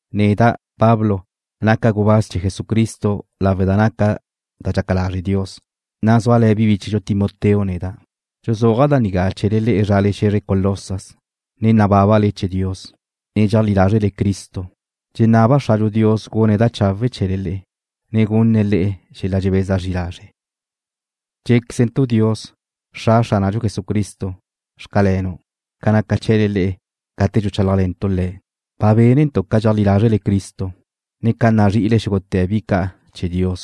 Neda', Pablo, naca' gubáz chee̱ Jesucristo lawe' da naca da dxaca lazre Dios, na' zúale̱ bi bíchedxu Timoteo neda'. Dxuzúaja' da nigá chee̱le le'e zrale xe̱zre Colosas, ne nabábale chee̱ Dios, ne dxeajlí lázrele Cristo. Dxenaba' Xradxu Dios gune̱' da chawe' chee̱le le'e, ne gunne̱' le'e xel-la dxebeza zri lazre'. Dxé̱quezentu' Dios, Xra Xránadxu Jesucristo: Xcalenu' ca naca chee̱le gate dxuchálajle̱ntu' Le̱'. Ba bénentu' ca dxeajlí lázrele Cristo, ne ca nazri'ile xúgute̱ bi ca' chee̱ Dios.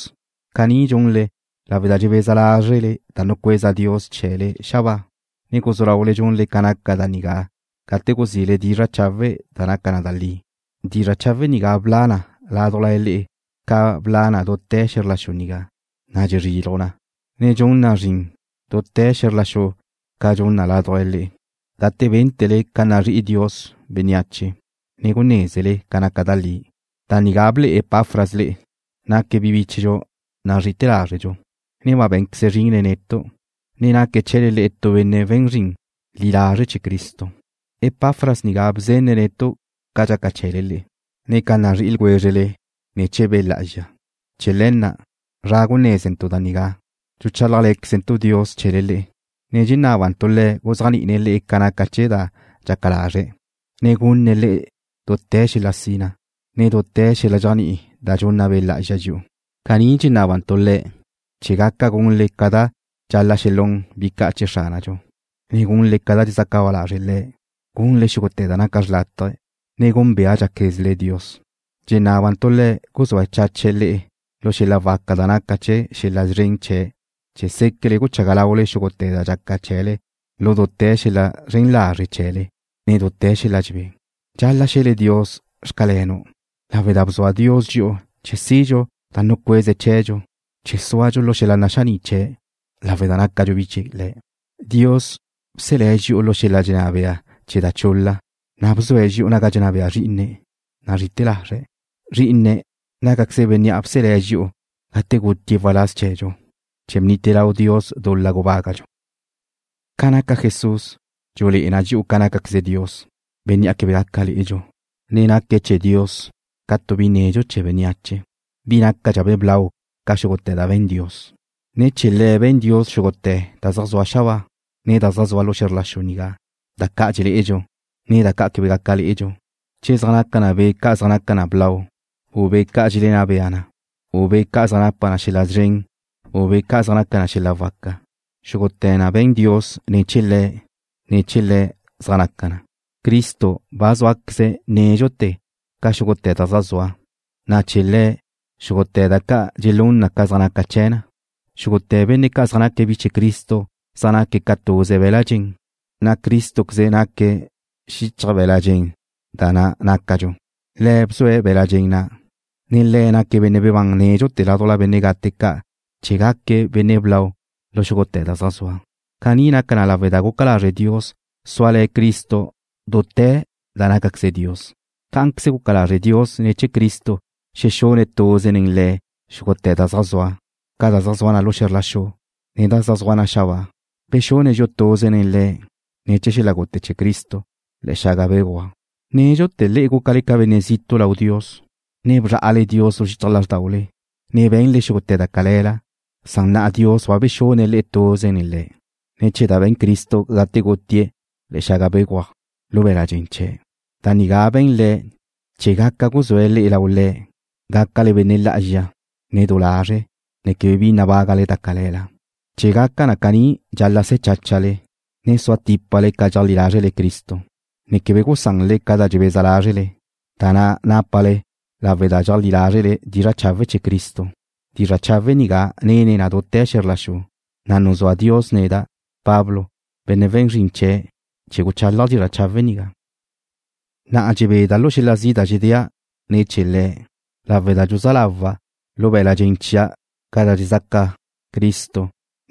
Caní dxunle lawe' da dxebeza lázrele da nucueza Dios chee̱le xabáa, na' guzú laule dxunle ca naca da nigá gate guzile dizra' chawe' da naca na da li. Dizra' chawe' nigá bla na ládujla le'e ca bla na dute̱ xe̱zr la xu nigá, na' dxezriluj na, ne dxun na zrin dute̱ xe̱zr la xu ca dxun na ládujla le'e, gate bénte̱le ca nazrí'i Dios bénneache, ne gunézele naca na da li. Da nigá ble'e Epafras le'e. Naque̱' bi bíchedxu nazrí'i lázredxu, ne ba bé̱nqueze̱' zrin nen netu', ne naque̱' chee̱le le'e tu benne' we̱n zrin li lazre' chee̱ Cristo. Epafras nigá bzenne̱' netu' ca dxaca chee̱le le'e, ne ca nazrí'i ljwézrele ne̱ chee̱ Be' Lá'azxa. Chee̱ le̱ na', zra gunézentu' da nigá, dxuchálajle̱quezentu' Dios chee̱le le'e, ne dxenábantu' Le̱' guzéajni'ine̱' le'e ca naca da dxaca lazre̱', ne gunne̱' le'e dute̱ xel-la sina, ne dute̱ xel-la dxéajni'i da dxunna Be' Lá'azxa dxi'u. Caní dxenábantu' Le̱' chee̱ gaca gunle ca dxal-la' xelún bi ca' chee̱ Xránadxu, ne gunle ca da dxezaca ba lazre' Le̱', gunle xúgute̱ da naca da xrlátaje, ne gúnbeadxaquezle Dios. Dxenábantu' Le̱' guzúa chache̱' le'e lu xel-la waca da naca chee̱ xel-la szren chee̱' chee̱ séquele guchaga laule xúgute̱ da dxaca chee̱le lu dute̱ xel-la zren lazre' chee̱le, ne dute̱ xel-la dxebé. Dxal-la' xe̱le Dios: Xcalenu', lawe' da bzua Dios dxi'u chee̱ sidxu da nucueze̱' chee̱dxu, chee̱ súadxu lu xel-la naxaní' chee̱', lawe' da nácadxu bi chee̱ Le̱'. Dios bselé̱' dxi'u lu xel-la dxenná bea chee̱ da chul-la, na' bzue̱' dxi'u naga dxenná bea Zrí'ine̱' nazri'ite̱ lazre̱'. Zrí'ine̱' nácaqueze̱' Bénnea' bselé̱' dxi'u gate gutie̱' waláz chee̱dxu, chee̱ bnite lau Dios dul-la gubágadxu. Ca naca Jesús, dxulé'e na dxi'u ca nácaqueze Dios, Bénnea' quebe gaca lé'edxu, ne naque̱' chee̱ Dios ca tu bi nedxu chee̱ bénneache, bi nácadxabe' blau ca xúgute̱ da be̱n Dios. Ne̱ chee̱ Le̱' be̱n Dios xúgute̱ da zaj zua xabáa, ne da zaj zua xe̱zr la xu nigá, da ca' dxelé'edxu, ne da ca' quebe gaca lé'edxu, che zaj naca na be' ca' zaj naca na blau, u be' ca' dxelenná bea na, u be' ca' zaj napa na xel-la szren, u be' ca' zaj napa na xel-la waca, xúgute̱ na be̱n Dios ne̱ chee̱ Le̱', na' chee̱ Le̱' zaj naca na. Cristo ba zúaqueze̱' nédxute̱ ca xúgute̱ da zaj zua, na' ne̱ chee̱ Le̱' xúgute̱ da ca' dxelún na ca zaj naca chee̱ na. Xúgute̱ benne' zaj naque̱' bi chee̱ Cristo zaj naque̱' ca tuze be̱l-la' dxen, na' Crístoqueze naque̱' xichaj be̱l-la' dxen na' da nácadxu. Le̱' bzue̱' be̱l-la' dxen na', ne Le̱' naque̱' Benne' bebán nédxute̱ ládujla benne' gate ca' chee̱ gaque̱' Benne' blau lu xúgute̱ da zaj zua. Caní naca na lawe' da guca lazre' Dios súale̱ Cristo dute̱ da nácaqueze Dios. Cá'anqueze guca lazre' Dios ne̱ chee̱ Cristo xexune̱' tuze nen Le̱' xúgute̱ da zaj zua, ca da zaj zua na lu xe̱zr la xu, ne da zaj zua na xabáa. Bexune̱' dxi'u tuze nen Le̱' ne̱ chee̱ xel-la gute chee̱ Cristo le̱'e̱ xaga béguaj. Nédxute̱ le'e gúcale ca benne' zitu' lau Dios, ne bzrá'ale Dios lu xichaj lázrdaule, ne be̱nle xúgute̱ da cale̱la, san na'a Dios ba bexune̱' le'e tuze nen Le̱', ne̱ chee̱ da be̱n Cristo gate gutie̱' le̱'e̱ xaga béguaj lu be̱la' dxen chee̱'. Da nigá be̱n Le̱' chee̱ gaca guzúe̱' le'e lau Le̱', gácale benne' lá'azxa, ne du lazre', ne quebe bi nabágale da cale̱la. Chee̱ gaca caní dxal-la' se̱ cháchale, ne sua típale ca dxeajlí lázrele Cristo, ne quebe gusanle ca da dxebeza lázrele, da na' nápale lawe' da dxéajle̱le dizra' chawe' chee̱ Cristo. Dizra' chawe' nigá nene na dute̱ xe̱zr la xu, na' nuzúa Dios neda', Pablo, benne' we̱n zrin chee̱', chee̱ guchálaja' dizra' chawe' nigá. Na'a dxebeda' lu xel-la zi' da dxedéa' ne̱ chee̱le le'e, lawe' da dxuzá lawa' lu be̱l-la' dxen chia' ca da dxezaca Cristo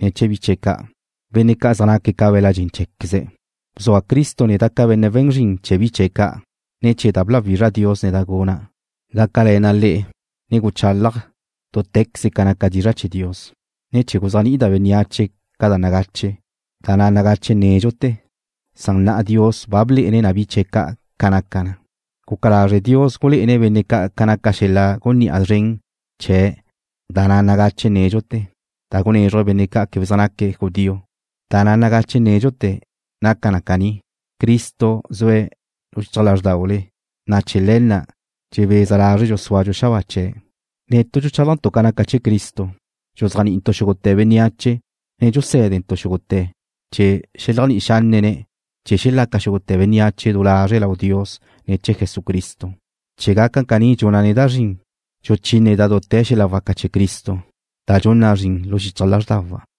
ne̱ chee̱ bi chee̱' ca', benne' ca' zaj naque̱' ca be̱l-la' dxen cheé̱queze̱'. Bzua Cristo neda' ca benne' we̱n zrin chee̱ bi chee̱' ca', ne̱ chee̱ da bláwizra Dios neda' guna', gácale̱na' le'e, na' guchálaja' dúte̱queze da naca dizra' chee̱ Dios, ne chee̱ guzéajni'ida' bénneache ca da nagache, da na' nagache nédxute̱, san na'a Dios ba blé'ene̱' bi chee̱' ca' ca naca na. Guca lazre' Dios gulé'ene̱' benne' ca' ca naca xel-la gunní'a zren chee̱ da na' nagache nédxute̱, da gunézruje̱' benne' ca' quebe zaj naque̱' judío. Da na' nagache nédxute̱ naca na caní: Cristo zue̱' xichaj lázrdaule, na' chee̱ le̱ na' dxebeza lázredxu súadxu xabáa chee̱'. Netu' dxuchálajntu' ca naca chee̱ Cristo. Dxuzéajni'intu' xúgute̱ bénneache, ne dxusé̱dentu' xúgute̱', chee̱ xeleajni'i xánnene̱' chee̱ xelaca xúgute̱ bénneache du lazre' lau Dios ne̱ chee̱ Jesucristo. Chee̱ gaca caní dxuna' neda' zrin, dxuchíneda' dute̱ xel-la waca chee̱ Cristo, da dxun na zrin lu xichaj lázrdawa'.